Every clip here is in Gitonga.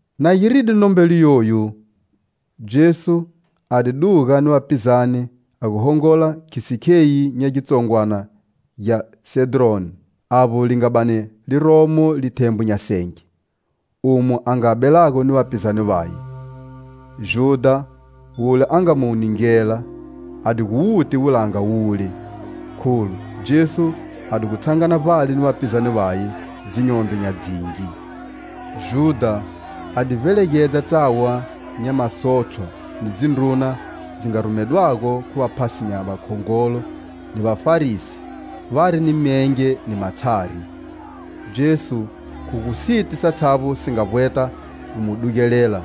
Na giride nombelo yoyu, Jesu a di duga ni vapizane a gu hongola khisi kheyi nya gitsongwana gya Sedroni, avbo li nga bani a liromo lithembwe nya senge, umo a nga belago ni vapizane vaye. Judha, wule a nga mu ningela, a di gu wuti wulanga wule, kholu Jesu a di gu tshangana vbale ni vapizane vaye dzinyondro nya dzingi. Judha a di vbelegedza tsawa nya masotshwa ni dzindruna dzi nga rumedwago khu vaphasi nya vakhongolo ni Vafarisi, vari ni myenge ni matshari. Jesu, khu gu siti satshavbo si nga vbweta gu mu dugelela,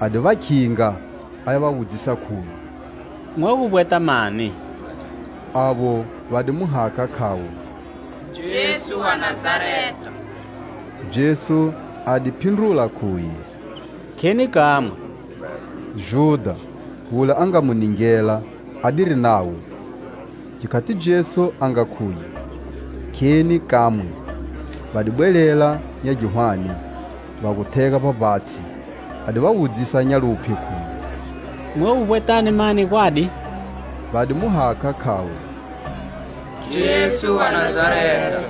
a di va khinga, aya va wudzisa, khuye: "Mwa gu vbweta mani?" Avo va di mu hakha, khavo: "Jesu wa Nazareta." Jesu a di phindrula khuye: "Kheni kamwe." Judha wule a nga mu ningela, adiri navo. Gikhati Jesu a nga khuye: "Kheni kamwe," va di bwelela nya gihwane, va gu thega vbavbatshi. A di va wudzisa nya luphye, khuye: "Mwa gu vbwetani mani, gwadi?" Va di mu hakha, khavo: "Jesu wa Nazareta."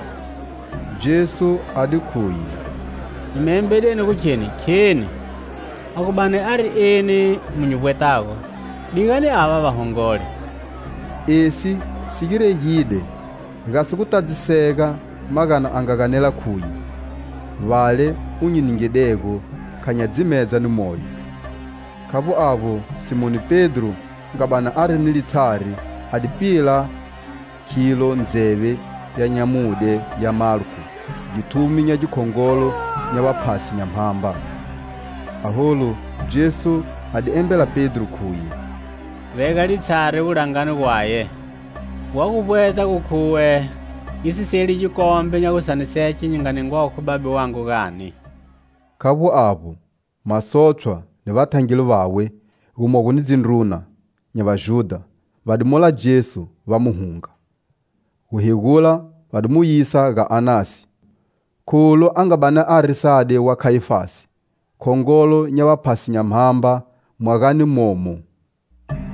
Jesu a di khuye: "Nyi mi embedeni gukheni kheni. A gu bani ari eni mu nyi vbwetago, digani ava va hongole." Esi si giregide gasi gutadzisega magana a nga ganela, khuye:"Vale u nyi ningidego kha nya dzimedza ni moyo." Khavbo avbo, Simoni Pedro, a nga bani ari ni litshari, a di pila khilo ndzeve ya nyamudye ya Malko, githumi gya khongolo nya vaphasi nya mhamba. Aholu, Jesu a di embela Pedro, khuye: "Vega litshari wulangani gwaye. Wa gu vbweta khuwe nyi si seli gikombe nya gutshaniseke nyi nga ningwago khu Babe wangu gani?" Khavbo avbo, masotshwa ni vathangeli vawe, gumogo ni dzindruna nya Vajudha, va di mola Jesu, va mu hunga. Guhegula va di mu yisa ga Anasi, kholu a nga bani ari sade wa Khayifasi, khongolo nya vaphasi nya mbamba mwagani momo.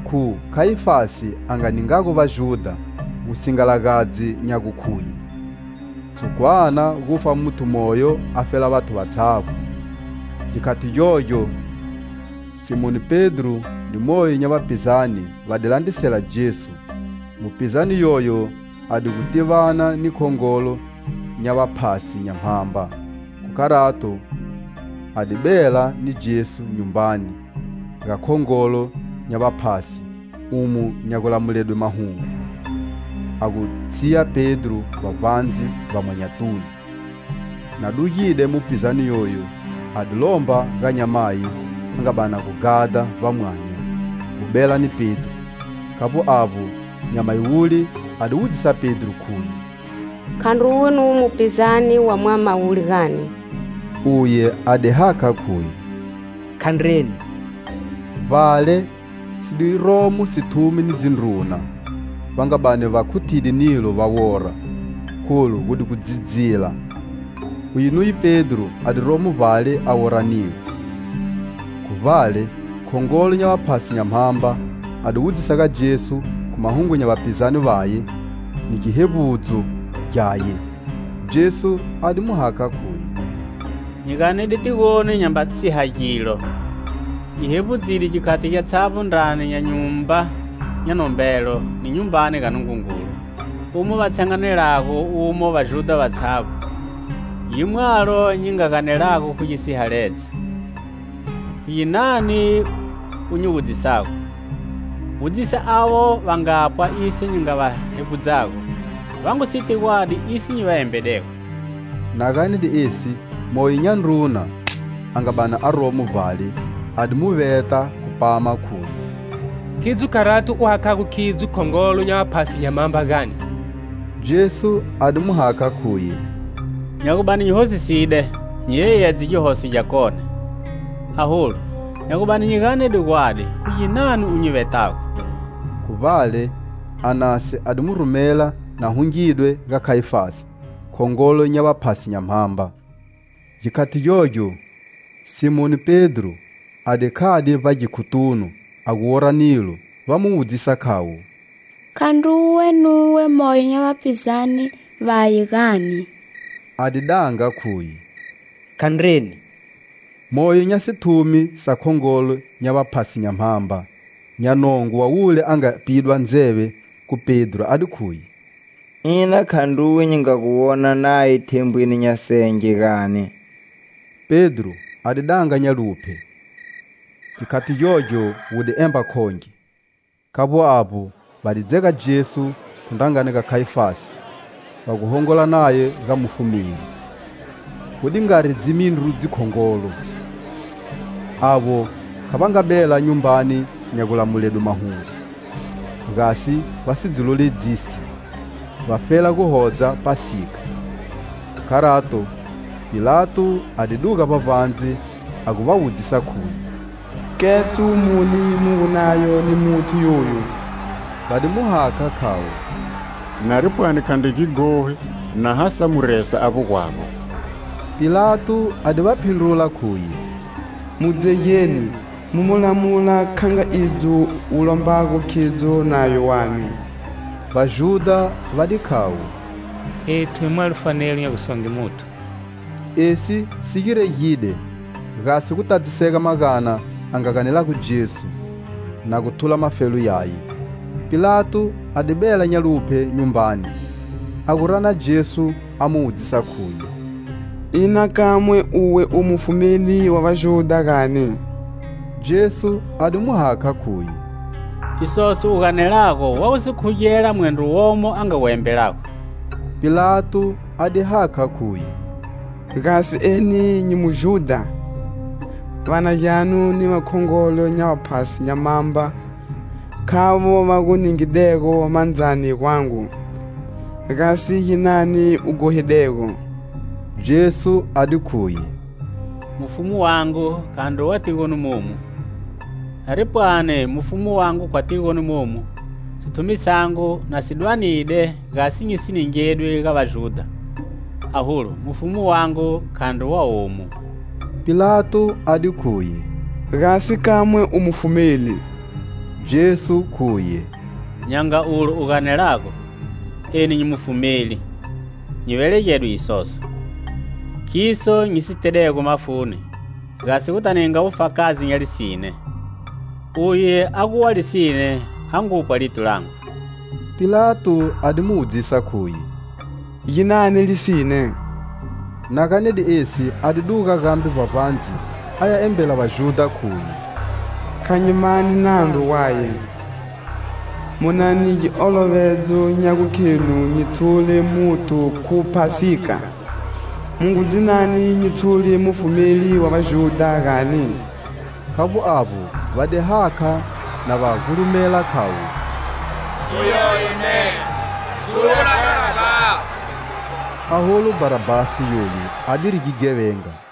Khu Khayifasi a nga ningago Vajudha wusingalagadzi nya gu khuye:"Tshukwana gufa muthu moyo afela vathu vatshavbo." Gikhati gyogyo, Simoni Pedro ni moyo nya vapizane va di landrisela Jesu. Mupizane yoyo a digu tivana ni khongolo nya vaphasi nya mhamba, khu kharato a di bela ni Jesu nyumbani ga khongolo nya vaphasi, umo nya gulamuledwe mahungu, a gu tshiya Pedro vbavbandze, vbamwanyatunu. Na dugide mupizane yoyu, a di lomba ga nyamayi a nga bani a gu ghada vbamwanya gu bela ni Pedro. Khavbo avbo, nyamayi wule a di wudzisa Pedro, khuye: "Khandruwe nuwe mupizane wa mwama wule gani?" Uye a di hakha, khuye: "Khandreni." Vbale, si di romo sithumi ni dzindruna, va nga bani va khuthide nilo va wora, kholu gu di gu dzidzila. Uye nuye Pedro a di romo vbale a wora nilo. Khu vbale, khongolo nya vaphasi nya mhamba a di wudzisa ga Jesu khu mahungu nya vapizane vaye ni gihevbudzo gyaye. Jesu a di mu hakha, khuye: "Nyi ganede tigoni nyamba siha gilo; nyi hevbudzide gikhati gyatshavbo ndrani nya Nyumba nya nombelo ni Nyumbani ya Nungungulu, umo va tshanganelago umo Vajudha vatshavbo, gimwalo nyi nga ganelago khu gisihaledza. Khu ginani u nyi wudzisago? Wudzisa avo va ngapwa iso nyi nga va hevbudzago; va ngu siti gwadi iso nyi va embedego." Na ganede esi, moyo nya ndruna a nga bani aromo vbale, a di mu veta khu pama, khuye: "Khidzo kharati u hakhago khidzo khongolo nya vaphasi nya mhamba, gani?" Jesu a di mu hakha, khuye: "Nya gu bani nyi hosiside, nyi yeyedze gihoso gyakone; aholu, nya gu bani nyi ganede gwadi, khu ginani u nyi vetago?" Khu vbale, Anasi a di mu rumela, na hungidwe, ga Khayifasi, khongolo nya vaphasi nya mhamba. Gikhati gyogyo, Simoni Pedro, a di khade vbagikhotunu a gu wora nilo va mu wudzisa, khavo: "Khandruwe nuwe moyo nya vapizane vaye, gani?" A di danga khuye: "Khandreni." Moyo nya sithumi sa khongolo nya vaphasi nya mhamba nya nongo wa wule a nga pidwa ndzeve khu Pedro, a di khuye: "Ina khandruwe nyi nga gu wona naye thembweni nya senge gani?" Pedro a di danga nya luphye. Gikhati gyogyo wu di emba khonge. Khavbo avbo, va di dzega Jesu khu ndrangani ga Khayifasi va gu hongola naye ga mufumeli. Gu di ngari dzimindru dzikhongolo. Avo kha va nga bela nyumbani nya gulamuledwe mahungu, gasi va si dzi loledzisi, vafela guhodza Phasika. Khu kharato, Pilato a di duga vbavbandze, a gu wudzisa khuye: "Ketso muni mu gu nayo ni muthu yoyu?" Va di mu hakha, khavo: "Nari pwani khandri gighogi na ha sa mu resa avbo gwago." Pilato a di va phindrula, khuye: "Mu dzegeni, mu mu lamula kha nga idzo wu lombago khidzo nayo wanu." Vajudha va di khayo: "Ethu hi mwalo fanelo nya gusonge muthu." Esi si giregide, gasi gutadzisega magana a nga ganelago Jesu, na guthula mafelo yaye. Pilato a di bela nya luphye nyumbani, a gu rana Jesu, a mu wudzisa, khuye: "Ina kamwe uwe u Mufumeli wa Vajudha gani?" Jesu a di mu hakha, khuye: "Isoso u ganelago wa gu si khugela mwendro womo a nga gu embelago?" Pilato a di hakha, khuye: "Gasi eni nyi Mujudha? Va na gyanu ni vakhongolo nya vaphasi nya mhamba khavo va gu ningedego mandzani gwangu. Gasi ginani u ghohidego?" Jesu a di khuye: "Mufumu wangu khandri wa tigoni momu. Nari pwani mufumu wangu khwa tigoni momu, sithumi sangu na si dwanide, gasi nyisi ningedwi ga Vajudha; aholu, mufumu wangu khandri wa omu." Pilato a di khuye: "Gasi kamwe u Mufumeli?" Jesu, khuye: "Nya nga ulo u ganelago! Eni nyi Mufumeli! Nyi velegedwe isoso; khiso nyi si tedego mafuni, gasi guta ninga wufakazi nya lisine. Uye a gu wa lisine a ngupwa lito langu." Pilato a di mu wudzisa, khuye: "Ginani lisine?" Na ganede esi, a di duga gambe vbavbandze, aya embela Vajudha, khuye: "Kha nyi mani nandru gwaye. Mu na ni giolovedzo nya gukhenu nyi tshule muthu khu Phasika. Mu ngu dzinani nyi tshule Mufumeli wa Vajudha, gani?" Khavbo avbo, va di hakha, na va gulumela, khavo: "Uyoyo ne, tshula Bharabhasi." Aholu Bharabhasi yoyu adiri gighevenga.